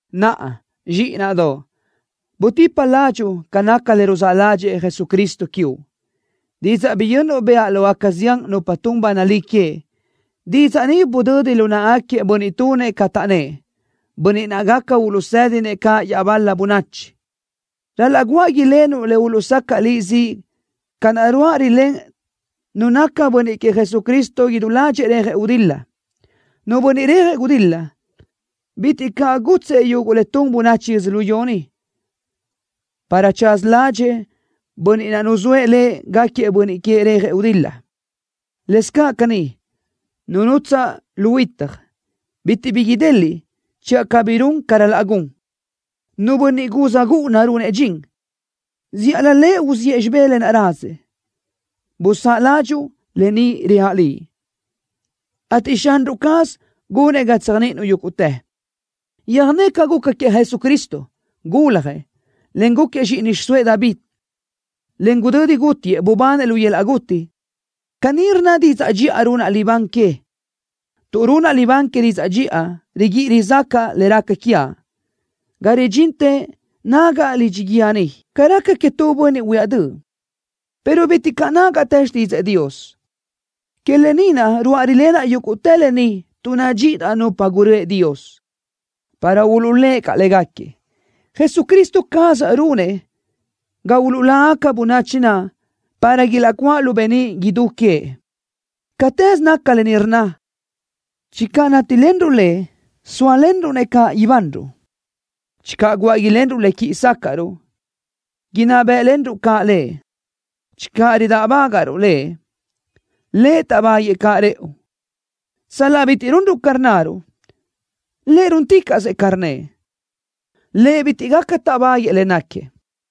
Naʼa, zxíʼinaʼdoʼ, butipa ládxuʼu ca naca le ruzáʼ ládxëʼë Jesucristo quiuʼ. Didzaʼ biyönnuʼ bëʼa lógaca zián nupa tun ba nalí que, didzaʼ ni budödi lu náʼagaquiëʼ bönniʼ tunëʼ ca taʼnnë́ʼ, bönniʼ gaca uluʼsédinëʼ caʼ iaʼbal-la bönachi. Ral-laʼ guáʼ ilenuʼ le uluʼsacaʼ liʼ ziʼ ca naʼ ruáʼ rilén nu naca bönniʼ queëʼ Jesucristo idú ládxëʼë rejëʼ gudil-la. Nu bönniʼ rejëʼ gudil-la, bitiʼ caʼ gútsëʼë yuguʼ le tun bönachi yödzölió ni, para tsaza ládxëʼë bönniʼ naʼ nuzóëʼ lëʼ gáquiëʼ bönniʼ queëʼ rejëʼ gudil-la. Lëscaʼ caní, nu nutsaʼ lu huitaj, bitiʼ bi ideliʼ channö cabí run ca ral-laʼ gun. Nu bönniʼ gúz gúʼuna runëʼ dxin, zíʼalö lëʼ uziʼë xibé lë naʼ razëʼ. Busáʼ ládxuʼu lë ni reaʼ liʼ, ateʼ Xanruʼ caz gunëʼ ga tséajniʼinuʼ yúguʼtë. Yöjné ca guca queëʼ Jesucristo. Guljëʼ, en gúquiëʼ zxíʼini xiʼsóëʼ David, en gudödi gútiëʼ, bubanëʼ lu yöl-laʼ guti. Caní rnna didzaʼ dxiʼa runaʼ libán que. Tuʼ runaʼ libán que didzaʼ dxiʼa, riguíʼi rizácaʼa le raca quiaʼ, ga ridxintë nágaʼa lidxi guíë ni, ca raca queëʼ tu bönniʼ huíaʼ döʼ, pero bitiʼ caʼ nágaʼtë xtídzëʼë Dios. Que lë ni naʼ ruáʼ rilénaʼ yúguʼtë lë ni tuʼ nadxíʼidaʼ nupa gurö́ëʼ Dios, para uluʼlë́ʼ caʼ légaquiëʼ. Jesucristo caz runëʼ ga uluʼlágaca bönachi naʼ para ilaʼcuáʼ lu beníʼ idú queëʼ. Catëz naca lë ni rnna: Channö nátilenruʼ Lëʼ, sóalenruʼ-nëʼ caʼ ibanruʼ. Channö guáʼ ilenruʼ le quíʼi sácaʼruʼ, inná bë́ʼlenruʼ caʼ Lëʼ. Channö ridáʼbagaʼruʼ Lëʼ, Lëʼ táʼbaguëʼë caʼ rëʼu. Sal-laʼ bitiʼ runruʼ ca rnnaruʼ, Lëʼ rúnticaʼsëʼ ca rnnëʼ. Lëʼ bitiʼ gaca táʼbaguëʼë le náquiëʼ.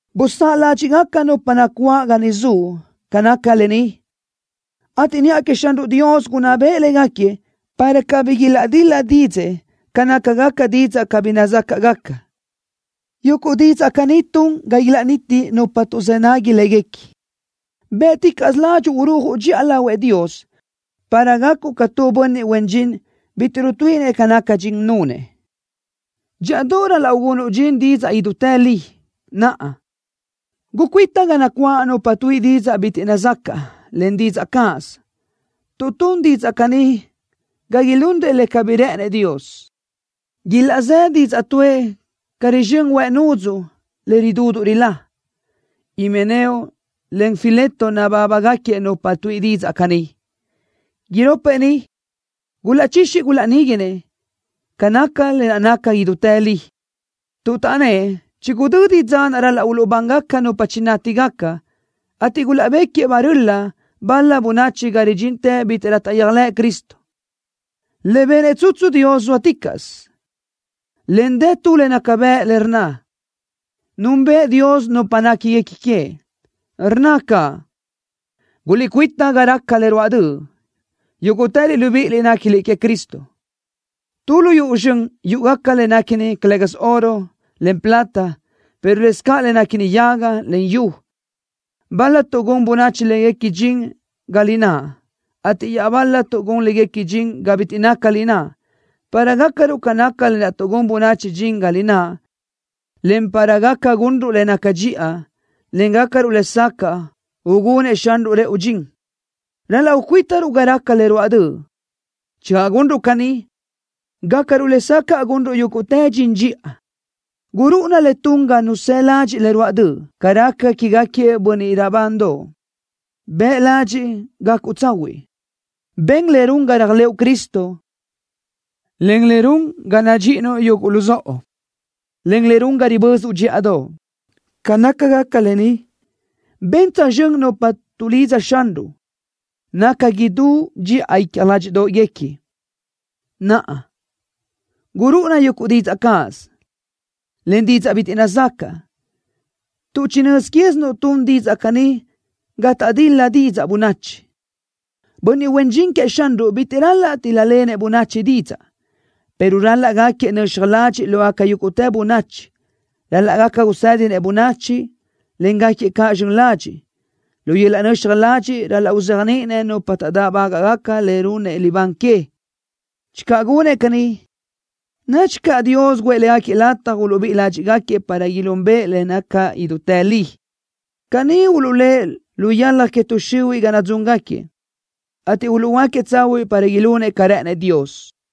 Busáʼ ládxiʼgaca nupa nacuáʼ ga niʼ zuʼ ca naca lë ni, ateʼ niʼa queëʼ Xanruʼ Dios gunná beʼe légaquiëʼ para cabí ilaʼdil-la dídzëʼë ca nácagaca didzaʼ cabí nazácaʼgaca. Yuguʼ didzaʼ caní tun ga ilaʼniti nupa tuʼzë́ nagui léguequi. Bë́ʼticaʼsö ládxuʼu urúajuʼ dxiʼa lahuëʼ Dios para gacuʼ ca tu bönniʼ huen dxin bitiʼ rutuíʼinëʼ ca naca dxin nunëʼ. Dxíʼadoʼ ral-laʼ ugunuʼ dxin didzaʼ idútë li. Naʼa, gucuíta ga nacuáʼ nupa tuíʼi didzaʼ bitiʼ nazacaʼ, en didzaʼ cáʼasö, tuʼ tun didzaʼ caní ga ilunrëʼ le cabí rë́ʼënëʼ Dios. Ilaʼzë́ didzaʼ tuʼë ca rizxö́n huëʼ nudzuʼ le ridúduʼ rilá. Himeneo, en Fileto nabábagaquiëʼ nupa tuíʼi didzaʼ caní. Iropëʼ ni gulaʼchixi gulaʼníguinëʼ ca naca le naca idútë li, tuʼ taʼnnë́ʼ chigudödi dza ral-laʼ uluʼbán nupa chinátigaca, ateʼ gulaʼbéquiëʼ barö́li bal-la bönachi ga ridxintë bítiʼrö taʼyéajlëʼ Cristo. Le benëʼ tsutsu Dios zóaticaʼsö, en dë tu le naca bëʼ, le rnna: “Núnbëʼë Dios nupa néquiguequi queëʼ.” Rnna caʼ: “Guliʼcuíta ga raca le ruáʼ döʼ, yúguʼtëliʼ libíʼiliʼ néquiliʼ queëʼ Cristo.” Tu lu yuʼu zxön yúʼugaca le néquini, calë́gasö oro, en plata, pero lëscaʼ le néquini yaga, en yu. Bal-la tuʼgún bönachi léguequi dxin ga lináʼ, ateʼ iaʼbal-la tuʼgún léguequi dxin ga bitiʼ naca lináʼ. Para gácaruʼ ca naca lë naʼ tuʼgún bönachi dxin ga lináʼ, en para gaca gunruʼ le naca dxiʼa, en gácaruʼ lesacaʼ ugunëʼ Xanruʼ rëʼu dxin, ral-laʼ ucuítaruʼ ga raca le ruáʼ döʼ. Channö gunruʼ caní, gácaruʼ lesacaʼ gunruʼ yúguʼtë dxin dxiʼa. Gurúʼuna le tun ga nu së ladxiʼ le ruáʼ döʼ ca raca quégaquiëʼ bönniʼ raʼbandoʼ. Bëʼ ladxiʼ gacuʼ tsahuiʼ. Ben le run ga réajlëʼu Cristo, en le run ga nadxíʼinuʼ yuguʼ luzóʼo, en le run ga ribözuʼ dxíʼadoʼ. Ca nácagaca lë ni, ben tsözxö́n nupa tuʼlidza Xanruʼ, naca idú dxiʼa icja ládxiʼdoʼguequi. Naʼa, gurúʼuna yuguʼ didzaʼ cáʼasö, en didzaʼ bitiʼ nazacaʼ, tuʼ chinö́z quézinuʼ tun didzaʼ caní ga taʼdil-la didzaʼ bönachi. Bönniʼ huen dxin queëʼ Xanruʼ bitiʼ ral-laʼ tíl-lalenëʼ bönachi didzaʼ, pero ral-laʼ gáquiëʼ nöxaj ladxiʼ lógaca yúguʼtë bönachi. Ral-laʼ gaca usédinëʼ bönachi, en gáquiëʼ caʼ zxön ladxiʼ. Lu yöl-laʼ nöxaj ladxiʼ ral-laʼ uzéajniʼinëʼ nupa taʼdáʼbagaʼ le runëʼ libán que. Channö gunëʼ caní, nadxi caʼ Dios guʼë légaquiëʼ lataj uluʼbíʼi ládxiʼgaquiëʼ para ilúnbëʼë le naca idútë li. Caní uluʼlë́ʼ lu yalaj que tuʼ xihuiʼ ga nadzúngaquiëʼ, ateʼ uluʼhuöáquiëʼ tsahuiʼ para ilunëʼ ca rë́ʼënëʼ Dios.